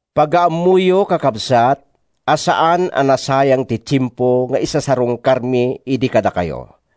Pagaammoyo, kakabsat, a saan a nasayang ti tiempo nga isasarungkarmi idi kadakayo.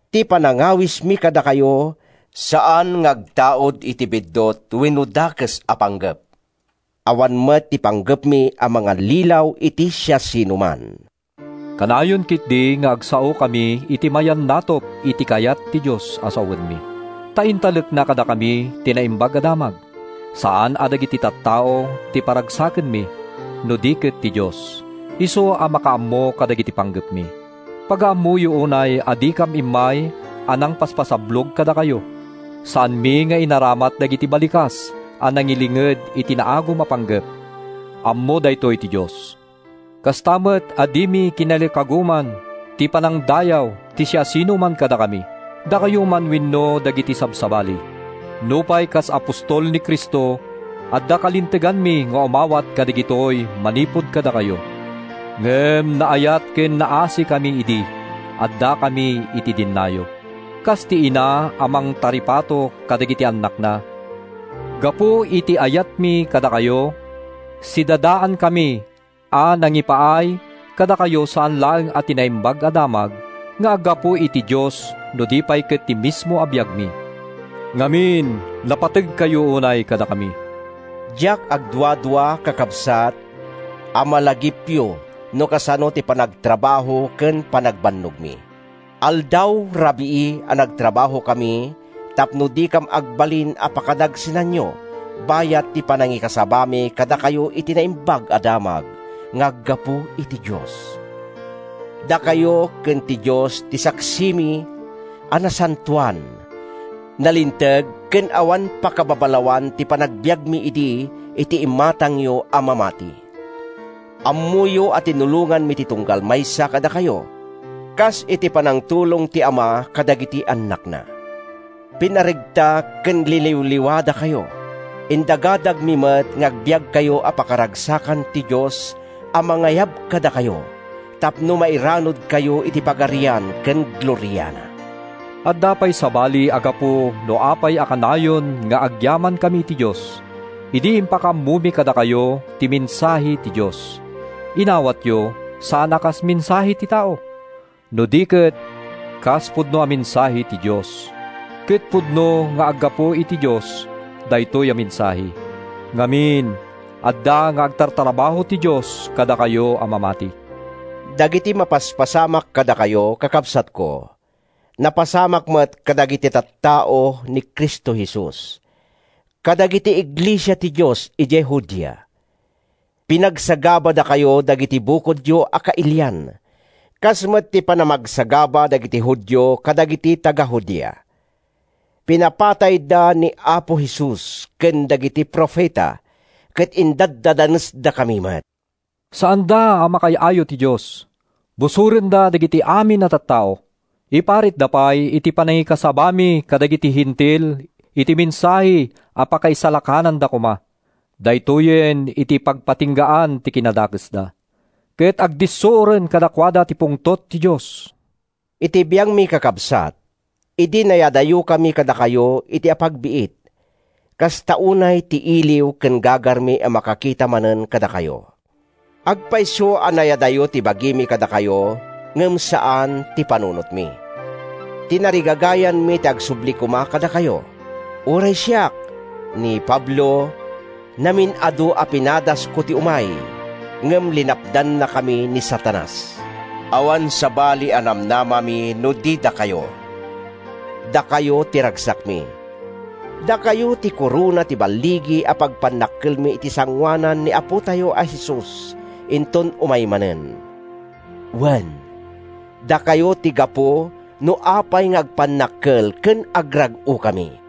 Ti panangawismi kadakayo saan nga agtaud iti biddut wenno dakes a panggep. Awan met ti panggepmi a mangallilaw iti siasinoman. Kanayon ketdi nga agsaokami iti mayannatup iti kayat ti Dios a sawenmi, ta intalekna kadakami ti Naimbag a Damag. Saan a dagiti tattao ti paragsakenmi no di ket ti Dios, isu a makaammo kadagiti panggepmi. Pagaammoyo unay a dikam immay nangpaspasablog kadakayo. Saanmi nga inaramat dagiti balikas a nangilinged iti naagum a panggep. Ammo daytoy ti Dios! Kasta met a dimi kinalikaguman ti panangdayaw ti siasinoman kadakami, dakayo man wenno dagiti sabsabali, nupay kas apostol ni Cristo, adda kalinteganmi nga umawat kadagitoy manipud kadakayo. Ngem naayat ken naasikami idi addakami iti dennayo, kas iti ina a mangtaripato kadagiti annakna. Gapu iti ayatmi kadakayo, sidadaankami a nangipaay kadakayo saan laeng a ti Naimbag a Damag nga aggapu iti Dios no di pay ket ti mismo a biagmi. Ngamin, napategkayo unay kadakami! Diak agduadua, kakabsat, a malagipyo no kasano ti panagtrabaho ken panagbannogmi. Aldaw-rabii a nagtrabahokami tapno dikam agbalin a pakadagsenanyo bayat ti panangikasabami kadakayo iti Naimbag a Damag nga aggapu iti Dios. Dakayo ken ti Dios ti saksimi, a nasantoan, nalinteg ken awan pakababalawan ti panagbiagmi idi iti imatangyo a mamati. Ammoyo a tinulonganmi ti tunggal maysa kadakayo, kas iti panangtulong ti ama kadagiti annakna. Pinaregta ken liniwliwadakayo. Indagadagmi met nga agbiagkayo a pakaragsakan ti Dios a mangayab kadakayo tapno mairanudkayo iti pagarian ken gloriana. Adda pay sabali a gapu no apay a kanayon nga agyamankami iti Dios. Idi impakaammomi kadakayo ti mensahe ti Dios, inawatyo, saan a kas mensahe ti tao, no di ket kas pudno a mensahe ti Dios. Ket pudno nga aggapu iti Dios daytoy a mensahe. Ngamin, adda nga agtartrabaho ti Dios kadakayo a mamati. Dagiti mapaspasamak kadakayo, kakabsatko, napasamak met kadagiti tattao ni Cristo Jesus, kadagiti iglesia ti Dios idiay Judea. Pinagsagabadakayo dagiti bukodyo a kailian, kas met ti panamagsagaba dagiti Judio kadagiti taga-Judea. Pinapatayda ni Apo Jesus ken dagiti profeta, ket indadanesdakami met. Saanda a makaay-ayo iti Dios! Busorenda dagiti amin a tattao! Iparitda pay ti panangikasabami kadagiti Hentil iti mensahe a pakaisalakananda koma. Daytoyen ti pagpatinggaan ti kinadakesda, ket agdissuoren kadakuada ti pungtot ti Dios! Iti biangmi, kakabsat, idi nayadayokami kadakayo iti apagbiit, kasta unay ti iliw ken gagarmi a makakita manen kadakayo! Agpayso a nayadayo ti bagimi kadakayo ngem saan ti panunotmi. Tinarigagayanmi ti agsubli koma kadakayo. Uray siak, ni Pablo, namin-adu a pinadasko ti umay, ngem linapdannakami ni Satanas. Awan sabali a namnamami no di dakayo. Dakayo ti ragsakmi. Dakayo ti korona ti balligi a pagpannakkelmi iti sangoanan ni Apotayo a Jesus inton umay manen. Wen, dakayo ti gapu no apay nga agpannakkel ken agrag-okami!